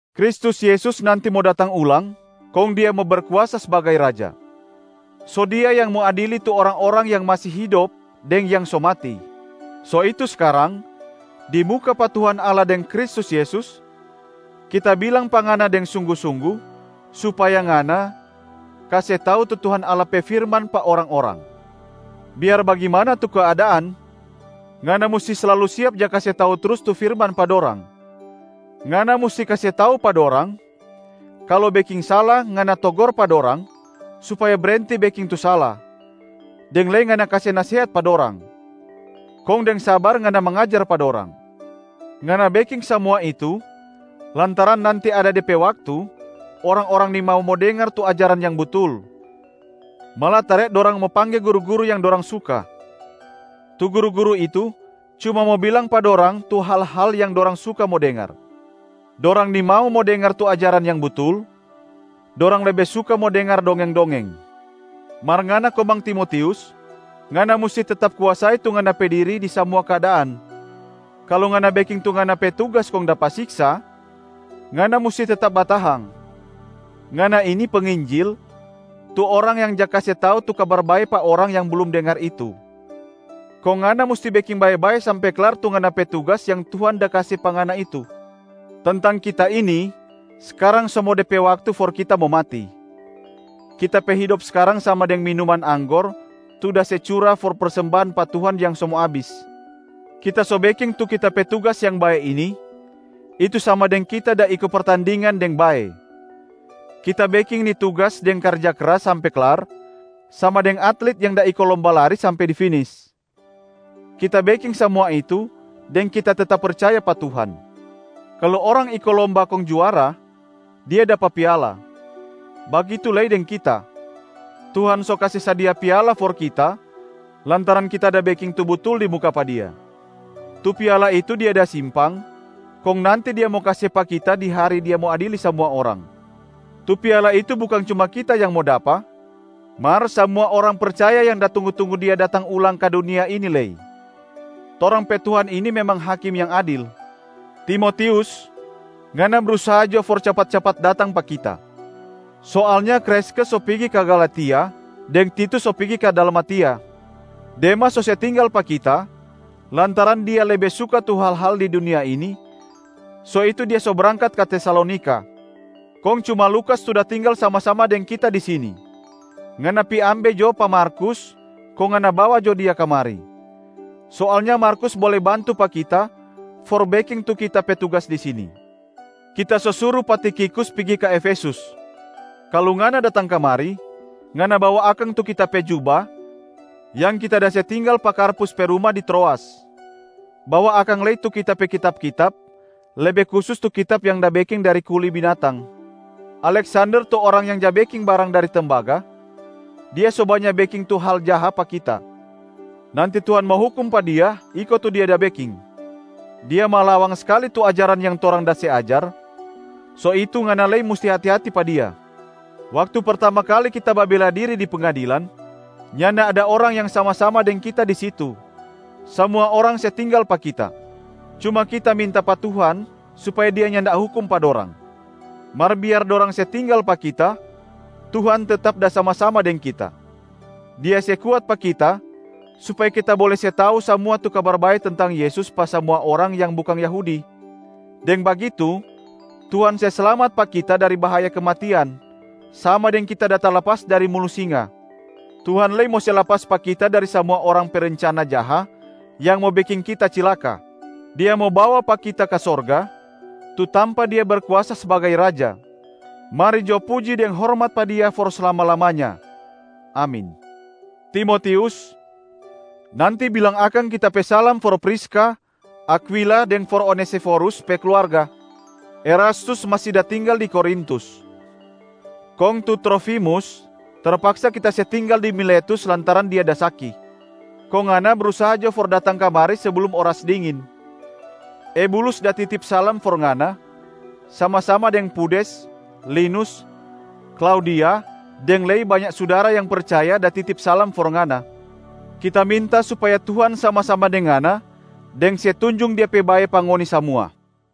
Kristus Yesus nanti mo datang ulang kong Dia mo Berkuasa sbagai Raja. So Dia yang mo adili tu orang-orang yang masi hidop deng yang so mati. So itu skarang di muka pa Tuhan Allah deng Kristus Yesus, kita bilang pa ngana deng sunggu-sunggu supaya ngana kase tau tu Tuhan Allah pe firman pa orang-orang. Biar bagimana tu keadaan ngana musti slalu siap ja kase tau trus tu firman pa dorang. Ngana musti kase tau pa dorang kalu beking sala, ngana togor pa dorang supaya brenti beking tu sala, deng lei ngana kase nasehat pa dorang. Kong deng sabar ngana mangajar pa dorang. Ngana beking samua itu lantaran nanti ada de pe waktu, orang-orang nimau mo dengar tu ajaran yang butul, malatare dorang mo pangge guru-guru yang dorang suka. Tu guru-guru itu cuma mo bilang pa dorang tu hal-hal yang dorang suka mo dengar. Dorang nimau mo dengar tu ajaran yang butul, dorang lebe suka mo dengar dongeng-dongeng. Mar ngana komang Timotius, ngana musti tetap kuasai tu ngana pe diri di samua keadaan. Kalu ngana beking tu ngana pe tugas kong dapa siksa, ngana musti tetap batahang. Ngana ini penginjil tu orang yang ja kase tau tu Kabar Bae pa orang yang blum dengar itu, kong ngana musti beking bae-bae sampe klar tu ngana pe tugas yang Tuhan da kase pa ngana itu. Tentang kita ini, skarang so mo de pe waktu for kita mo mati. Kita pe hidop skarang sama deng minuman anggor tu da se cura for persembahan pa Tuhan yang so mo abis. Kita so beking tu kita pe tugas yang bae ini, itu sama deng kita da iko pertandingan deng bae. Kita beking ni tugas deng karja kras sampe klar, sama deng atlit yang da iko lomba lari sampe di finis. Kita beking samua itu deng kita tetap percaya pa Tuhan. Kalu orang iko lomba kong juara, dia dapa piala. Bagitu lei deng kita, Tuhan so kase sadia piala for kita lantaran kita da beking tu butul di muka pa Dia. Tu piala itu Dia da simpang kong nanti Dia mo kase pa kita di hari Dia mo adili samua orang. Tu piala itu bukang cuma kita yang mo dapa mar samua orang percaya yang da tunggu-tunggu Dia datang ulang ka dunia ini lei. Torang pe Tuhan ini memang Hakim yang adil. Timotius! Ngana brusaha jo for capat-capat datang pa kita. Soalnya Kreskes so pigi ka Galatia deng Titus so pigi ka Dalmatia. Demas so se tinggal pa kita lantaran dia lebe suka tu hal-hal di dunia ini, so itu dia so brangkat ka Tesalonika. Kong cuma Lukas tu da tinggal sama-sama deng kita di sini. Ngana pi ambe jo pa Markus kong ngana bawa jo dia kamari. Soalnya Markus bole bantu pa kita for beking tu kita pe tugas di sini. Kita so suru pa Tikhikus pigi ka Efesus. Kalu ngana datang kamari, ngana bawa akang tu kita pe juba yang kita da se tinggal pa Karpus pe ruma di Troas. Bawa akang lei tu kita pe kitab-kitab, lebe kusus tu kitab yang da beking dari kuli binatang. Aleksander tu orang yang ja beking barang dari tembaga, dia so banya beking tu hal jaha pa kita. Nanti Tuhan mo hukum pa dia iko tu dia da beking. Dia malawang skali tu ajaran yang torang da se ajar. So itu ngana lei musti hati-hati pa dia. Waktu pertama kali kita babela diri di pengadilan, nyanda ada orang yang sama-sama deng kita di situ, samua orang se tinggal pa kita. Cuma kita minta pa Tuhan supaya Dia nyanda hukum pa dorang. Mar biar dorang se tinggal pa kita, Tuhan tetap da sama-sama deng kita. Dia se kuat pa kita supaya kita bole se tau samua tu Kabar Bae tentang Yesus pa samua orang yang bukang Yahudi. Deng bagitu Tuhan se slamat pa kita dari bahaya kematian, sama deng kita da talapas dari mulu singa. Tuhan lei mo se lapas pa kita dari samua orang pe rencana jaha yang mo beking kita cilaka. Dia mo bawa pa kita ka sorga, tu tampa Dia Berkuasa sbagai Raja. Mari jo puji deng hormat pa Dia for slama-lamanya! Amin. Timotius, nanti bilang akang kita pe salam for Priska, Akwila deng for Onesiforus pe kluarga. Erastus masi da tinggal di Korintus, kong tu Trofimus terpaksa kita se tinggal di Miletus lantaran dia da saki. Kong ngana brusaha jo for datang kamari seblum oras dingin. Ebulus da titip salam for ngana, sama-sama deng Pudes, Linus, Klaudia deng lei banya sudara yang percaya da titip salam for ngana. Kita minta supaya Tuhan sama-sama deng ngana deng se tunjung Dia pe bae pa ngoni samua.